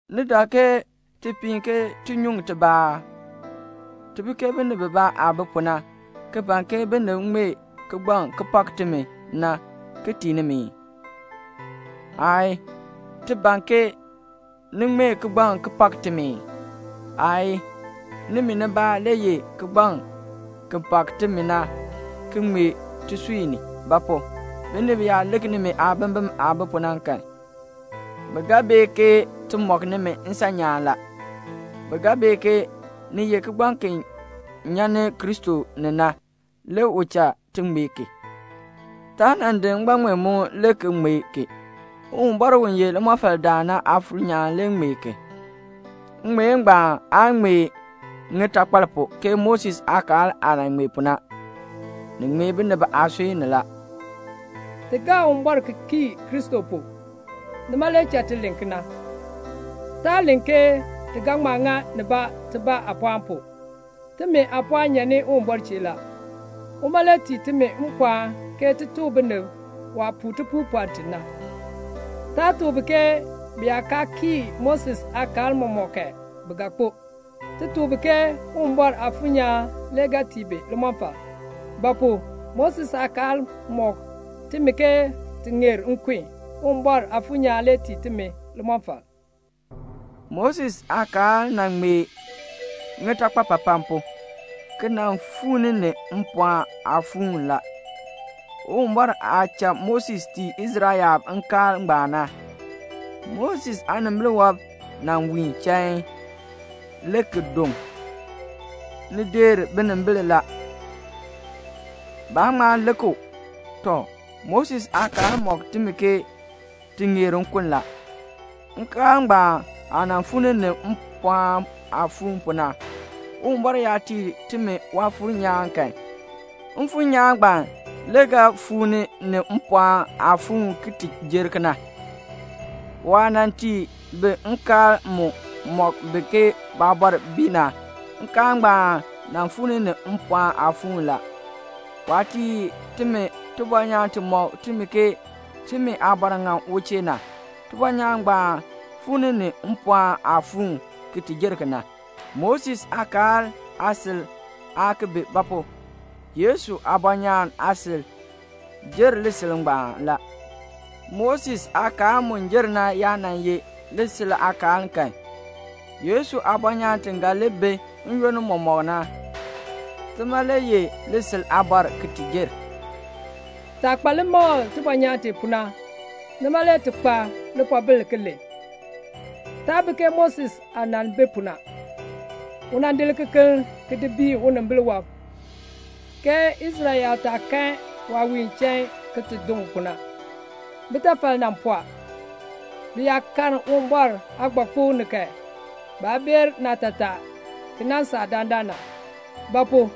Ni dak ke ti piin ke ti ki nyuŋ tibaa aa? Ti bi ke binib bibaa aah bi pu na, ki ban ke binib ŋmee kigbaŋ ki pak timi na, ti tii nimi ii? Aayii. Ti ban ke ni ŋmee kigbaŋ ki pak timi ii? Aayii. Nimi nibaa le ye kigbaŋ ki pak timi na ki ŋmee tisui ni. Ba pu? binib yaa lik nimi aabimbin aah bi pu na kan, bi ga bee ke ti mɔk nimi nsan nyaan la. Bi ga bee ke ni ye kigbaŋ ki nyan ni Kristo ni na, le u cha ti ŋmee ki. Taa nan di ngbaŋmeemuun le ki ŋmee ki. Uwumbɔr u ye limɔfaldaan na Aafuur nyaan le ŋmee ki. Ŋŋmeen ngbaan aa ŋmee ŋitakpal pu, ke Moses aakaal aah nan ŋmee pu na. Ni ŋmee binib aasui ni la. Ti gaa Uwumbɔr ki kii Kristo pu. Nima le cha ti len kena. Taa len ke ti ga ŋma ŋa nibaa tibaa aapɔɔn pu. Timi aapɔɔn nyan ni Uwumbɔr chee la. Uma le tii timi mpɔɔn ke ti tuk binib waah puu tipuupɔln ti na. Taa tuk bi ke bi yaa kaa kii Moses aakaal mɔmɔk kan, bi ga kpo. Ti tuk bi ke Uwumbɔr Aafuur nyaan le ga tii bi limɔfal. Ba pu? Moses aakaal mɔk timi ke ti ŋeer nkun, Uwumbɔr Aafuur nyaan le tii timi limɔfal. Moses aakaal nan ŋmee ŋitakpapapan pu, ki nan fuu ni ni mpɔɔn aafuun la. Uwumbɔr aah nan cha Moses tii Israel yaab nkaal ngbaan na, Moses aanimbil wɔb nan wiin chain, le ki doŋ. Ni deer binimbil la. Baa ŋma lik u. Tɔ, Moses aakaal mɔk timi ke ti ŋeer nkun la. Nkaal ngbaan aah nan fuu ni ni mpɔɔn aafuun pu na, Uwumbɔr yaa tii timi Waafuur nyaan kan, Mfuur nyaan ngbaan le ga fuu ni ni mpɔɔn aafuun ki ti jer kena. Waah nan tii bi nkaal mu mɔk bi ke baabɔr bii na, nkaal ngbaan nan fuu ni ni mpɔɔn aafuun la. Waah tii timi tibɔnyaan ti mɔk timi ke timi aabɔr ŋan u chee na, tibɔnyaan ngbaan fuu ni ni mpɔɔn aafuun, ki ti jer kena. Moses aakaal aasil aa ki bi; ba pu? Yesu aabɔnyaan aasil jer lisil ngbaan la. Moses aakaal mu jer na yaa nan ye lisil aakaal kan, Yesu aabɔnyaan ti ga li bi n-yoonn mɔmɔk na, tima le ye lisil aabɔr ki ti jer. Taah kpa limakl tibɔnyaan tee pu na, nima le ti kpa lipoobil ki len. Taa bi ke Moses aah nan bi pu na. U nan di likekeln ki di biin unimbil wɔb, ke Israel yaab taa kan waah wiin chain ki ti doŋ pu na. Bitafal nan pɔɔ. Bi yaa karn Uwumbɔr aagbakpok ni kan, baa bee naatataa ki nan saa dandana. Ba pu?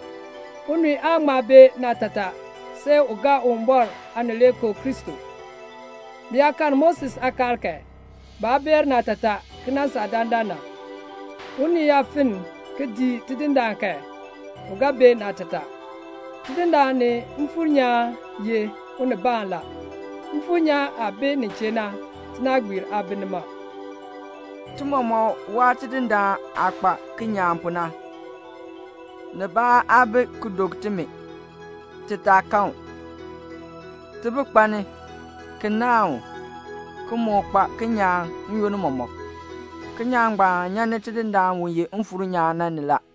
unii aan ŋma bee naatataa see u gaa Uwumbɔr Aanileekoo Kristo. Bi yaa karn Moses aakaal kan, baa beer naatataa ki nan saa dandana. Unii yaa fenn ki dii Tidindaan kan, u ga bee naatataa. Tidindaan ni Mfuur nyaan ye Unibaan la. Mfuur nyaan aah bi nin chee na, tinaagbiir aa bi nima. Le ti mɔmɔk waa Tidindaan aah kpa kinyaan pu na. Nibaa aa bi ki dok timi, ti taa kan u. Ti bi kpalni, ki naahn u, ki moo kpa kinyaan n-yoonn mɔmɔk. Kinyaan ngbaan nyan ni Tidindaan u ye Mfuur nyaan na ni la.